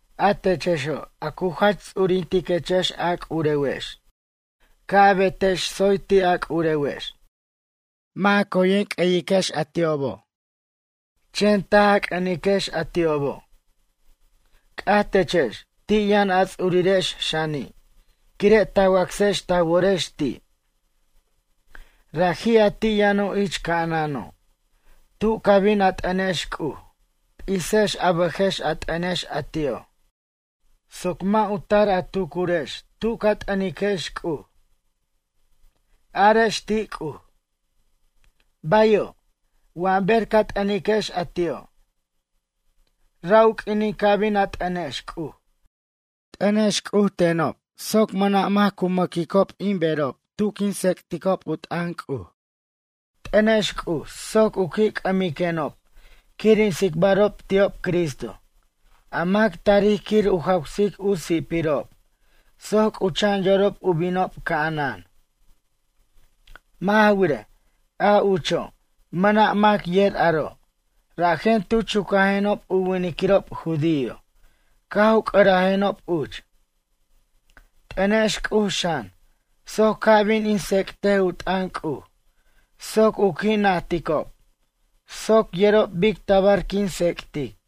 A techexo', a cu jach ts'urintechex a c'urewex, ca' a betex tsoy ti' a c'urewex. Mʌ' coyen a q'ueyiquex a ti'obo', chen taj a c'ʌniquex a ti'obo'. C'aj techex ti' yʌn a ts'urirex xani', quire' ta wacsex ta worex ti'. Raji' a ti' yʌno' ich ca'anano'. Tu ca bin a t'ʌnex C'uj, p'isex a bʌjex a t'ʌnex a ti'o', soc mʌ' u tar a tucurex tu' ca t'ʌniquex C'uj. Arex ti' C'uj: “Bayo'”, wa ber ca t'ʌniquex a ti'o'. Ra' u q'uinin ca bin a t'ʌnex C'uj, t'ʌnex C'uj tenob soc mʌna' mac cu mʌ'quej in berob tu quin tsec'ticob u t'ʌn C'uj. T'ʌnex C'uj soc u qui' c'ʌmiquenob quir in tsicbarob ti'ob Cristo, a mac tarij quir u jawsic u si'pirob soc c'ucha'an yorob u binob ca'anan. Mʌ' ja wirej, a ucho' mʌna' mac yer aro', rajen tu chucajenob u winiquirob judío caj u c'ʌrajenob uch. T'ʌnex C'uj xan, soc ca' bin in tsec'tej u t'ʌn C'uj, soc u qui' najticob soc yerob bic tabar quin tsec'tic.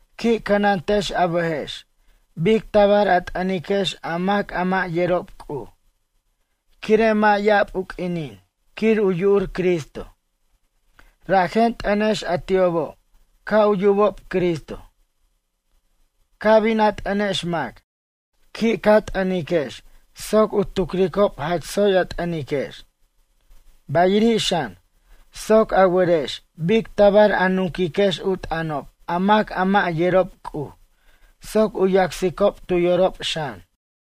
Qui' cʌnantex a bʌjex bic tabar a t'ʌniquex a mac a mʌ' yerob C'uj, quire' mʌ' ya'ab u q'uinin quir u yu'ur Cristo, rajen t'ʌnex a ti'obo' ca' u yubob Cristo. Ca' bin a t'ʌnex mac, qui' ca t'ʌniquex soc u tucricob jach tsoy a t'ʌniquex. Bayiri' xan, soc a werex bic tabar a nunquiquex u t'ʌnob a mac a mʌ' yerob C'uj soc u yacsicob tu yorob xan.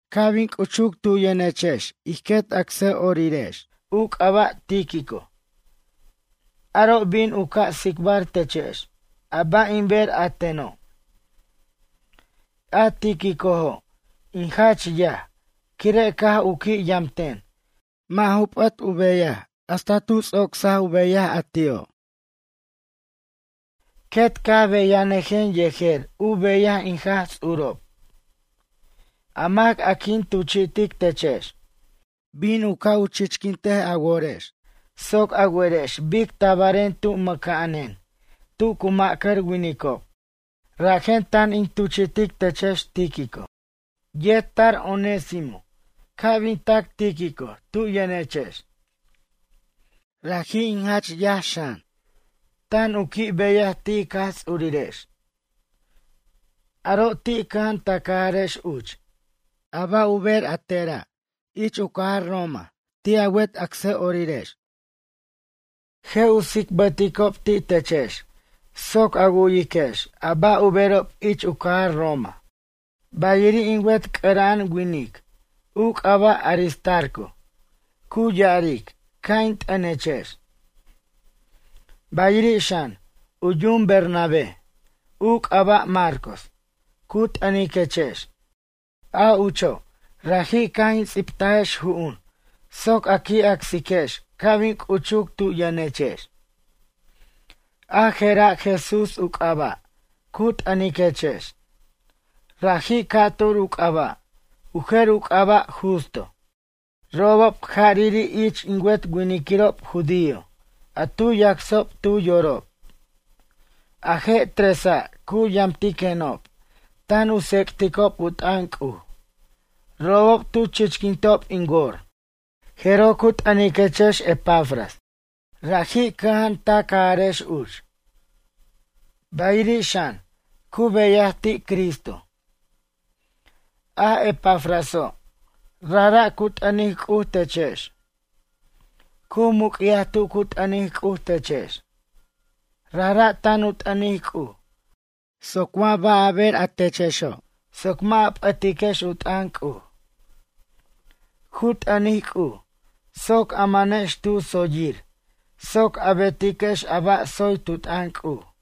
Ca' bin c'uchuc tu yʌnechex ij quet acsʌ'orirex, u c'aba' Tíquico, aro' bin u ca' tsicbar techex a ba' in ber a teno'. A Tíquicojo', in jach yaj, quire' caj u qui' yamten, mʌ' ju p'ʌt u beyaj hasta tu ts'ocs u beyaj a ti'o'. Quet caj beyanʌjen yejer u beyaj in Jaj Ts'urob. A mac a quin tuchi'tic techex, bin u ca' chichquint a worex soc a werex bic tabaren tu mʌca'anen tu cu ma'cʌr winicob, rajen tan in tuchi'tic techex Tíquico. Yet tar Onésimo ca' bin tac Tíquico tu yʌnechex. Raji' in jach yaj xan, tan u qui' beyaj ti' ic Jaj Ts'urirex. Aro' ti' cʌja'an ta cajarex uch. A ba' u ber a tera' ich u cajar Roma ti' a wet acsʌ'orirex, je' u tsicbʌticob ti' techex soc a wu'yiquex a ba' u berob ich u cajar Roma. Bayiri' in wet c'ʌra'an winic, u c'aba' Aristarco cu ya'aric ca' in t'ʌnechex. Bayiri' xan, u yum Bernabé, u c'aba' Marcos, cu t'ʌniquechex. A ucho' raji' caj in ts'ibtajex ju'un soc a qui' acsiquex ca' bin c'uchuc tu yʌnechex. A je'ra' Jesús u c'aba', cu t'ʌniquechex. Raji' ca'tur u c'aba', u jer u c'aba' Justo. Robob jariri' ich in wet winiquirob judío a tu yacsob tu yorob. A je' tresa' cu yamtiquenob tan u tsec'ticob u t'ʌn C'uj. Robob tu chichquintob in wor. Jeroj cu t'ʌniquechex Epafras. Raji' cʌja'an ta cajarex uch. Bayiri' xan, cu beyaj ti' Cristo. A Epafraso', rajra' cu t'ʌnic C'uj techex. Cu muc'yaj tu cu t'ʌnic C'uj techex. Rajra' tan u t'ʌnic C'uj soc wa ba' a ber techexo' soc mʌ' a p'ʌtiquex u t'ʌn C'uj. Cu t'ʌnic C'uj soc a manex tu tsoyir soc a betiquex a ba' tsoy tu t'ʌn C'uj.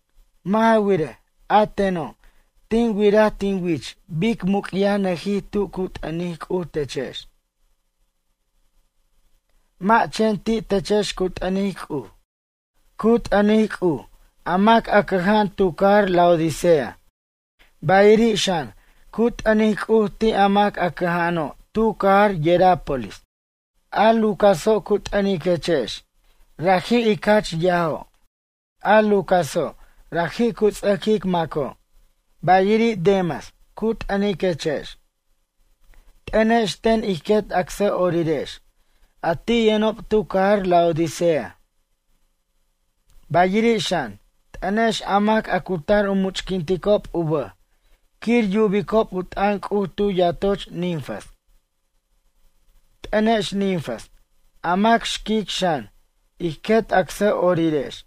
Mʌ' ja wirej, a teno' tin wiraj tin wich bic muc'yajnʌjij tu cu t'ʌnic C'uj techex. Mʌ' chen ti' techex cu t'ʌnic C'uj, cu t'ʌnic C'uj a mac a cʌja'an tu cajar Laodicea, bayiri' xan cu t'ʌnic C'uj ti' a mac a cʌja'ano' tu cajar Hierápolis. A Lucaso' cu t'ʌniquechex, raji' ic jach yajo'. A Lucaso' raji' cu ts'ʌquic maco', bayiri' Demas cu t'ʌniquechex. T'ʌnex ten ij quet acsʌ'orirex, a ti' yʌnob tu cajar Laodicea. Bayiri' xan, t'ʌnex a mac a cu tar u much'quintob u bʌj quir yubicob u t'ʌn C'uj tu yatoch Ninfas. T'ʌnex Ninfas, a mac xquic xan, ij quet acsʌ'orirex.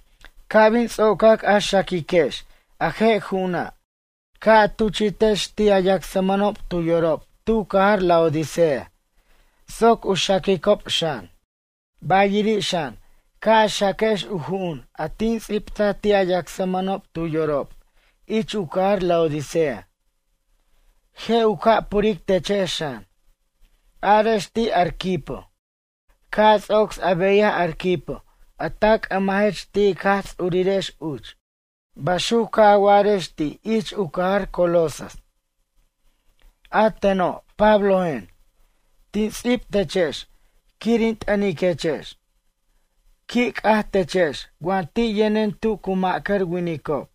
Ca' bin ts'ocac a xaquiquex a je' ju'una', ca' a tuchi'tex ti' a yacsmʌnob tu yorob tu cajar Laodicea soc u xaquicob xan. Bayiri' xan, ca' a xaquex u ju'un a tin ts'ibtaj ti' a yacsmʌnob tu yorob ich u cajar Laodicea. Je' u ca' puric techex xan. Arex ti' Arquipo: “Ca' a ts'ocs a beyaj Arquipo a ta c'ʌmajech ti' ic Jaj Ts'urirex uch.” Baxuc ca' a wa'arex ti' ich u cajar Colosas. A teno' Pablojen, tin ts'ib techex quir in t'ʌniquechex. Qui' c'aj techex wa ti' yʌnen tu cu ma'cʌr winicob.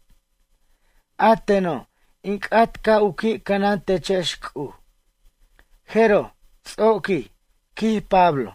A teno' in c'at ca' u qui' cʌnan techex C'uj, jeroj ts'oquij, quij Pablo.